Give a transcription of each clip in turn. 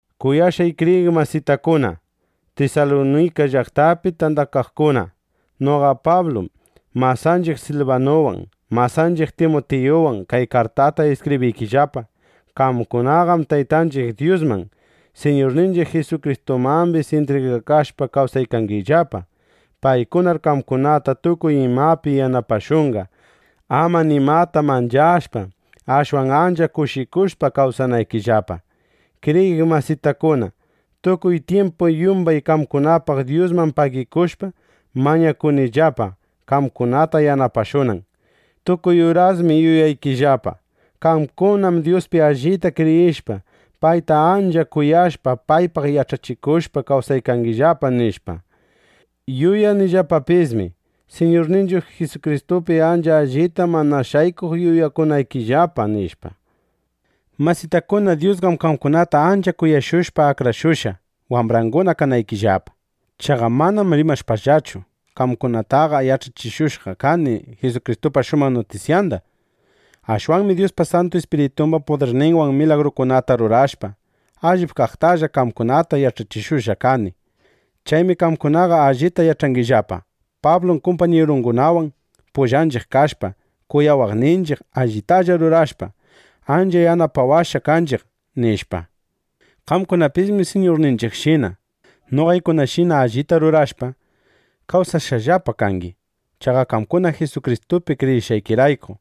Kuyashqay kriyiq masitakuna Tisalunika llaqtapi tandakaqkuna, noqa Pablum, masanchiq Silbanuwan, masanchiq Timutiyuwan kay kartata iskibriykillapa. Qamkunaqam Taytanchiq Dyusman, Siñurninchiq Jisukristumambis intrigakashpa kawsaykangillapa. Paykunar qamkunata tukuy imapi yanapashunqa, ama nimata manchashpa, ashwan ancha kushikushpa kawsanaykillapa. Kriyiq masitakuna, tukuy tyimpum yumbay qamkunapaq Dyusman pagikushpa, mañakunillapa, qamkunata yanapashunan. Tukuy urasmi yuyaykillapa: Qamkunam Dyuspi allita kriyishpa, payta ancha kuyashpa, paypaq yach'achikushpa kawsaykangillapa, nishpa. Yuyanillapapismi: Siñurninchiq Jisukristupi ancha allita mana shaykuq yuyakuykangillapa, nishpa. Masitakuna, Dyusqam qamkunata ancha kuyashushpa, akrashushqa, wambranguna kanaykillapa. Chaqa manam rimashpallachu, qamkunataqa yach'achishushqa kani Jisukristupa shumaq nutisyanda. Ashwanmi Dyuspa Santu Ispiritumba pudirninwan milagrukunata rurashpa, allip kaqtalla qamkunata yach'achishushqa kani. Chaymi qamkunaqa allita yach'angillapa: Pablum kumpañirungunawan pullanchiq kashpa, kuyawaqninchiq, allitalla rurashpa, ancha yanapawashqa kanchiq, nishpa. Qamkunapismi Siñurninchiqshina, noqaykunashina allita rurashpa, kawsashqallapa kangi. Chaqa qamkuna Jisukristupi kriyishqaykirayku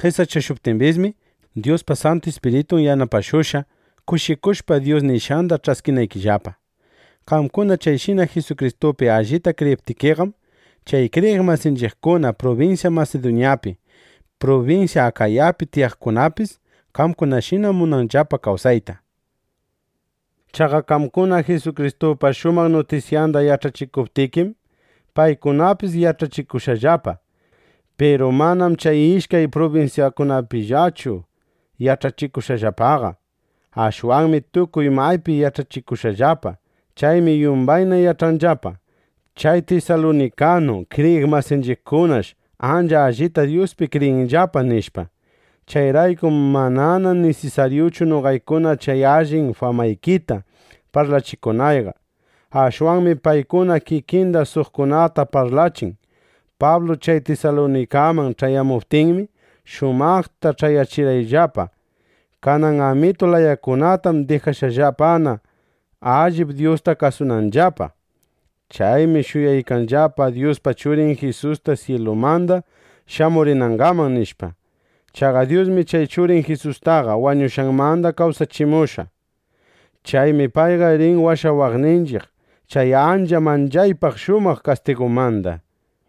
qesachashuptimbismi, Dyuspa Santu Ispiritun yanapashushqa, kushikushpa Dyus nishqanda ch'askinaykillapa. Qamkuna chayshina Jisukristupi allita kriyiptikiqam, chay kriyiq masinchiqkuna prubinsya Masiduñapi, prubinsya Akayapi tiyaqkunapis, qamkunashina munanllapa kawsayta. Chaqa qamkuna Jisukristupa shumaq nutisyanda yach'achikuptikim, paykunapis yach'akushqallapa. Piru manam chay ishkay prubinsyapillachu yach'akushqallapaqa. Ashwanmi tukuy maypi yach'akushqallapa. Chaymi yumbayna yach'anllapa: Chay tisalunikanu kriyiq masinchiqkunash ancha allita Dyuspi kriyinllapa, nishpa. Chayraykum manana nisisaryuchu noqaykuna chay allin famaykita parlachikunayqa. Ashwanmi paykuna kikinna suqkunata parlachin: Pablu chay Tisalunikaman ch'ayamuptinmi, shumaqta ch'ayachirqanllapa. Kanan amitu layakunatam dijashqallapana, allip Dyusta kasunanllapa. Chaymi shuyaykanllapa Dyuspa Churin Jisusta syilumanda shamurinangaman, nishpa. Chaqa Dyusmi chay Churin Jisustaqa wañushqanmanda kawsachimushqa. Chaymi payqa rin washawaqninchiq chay ancha manchaypaq shamuq kastigumanda.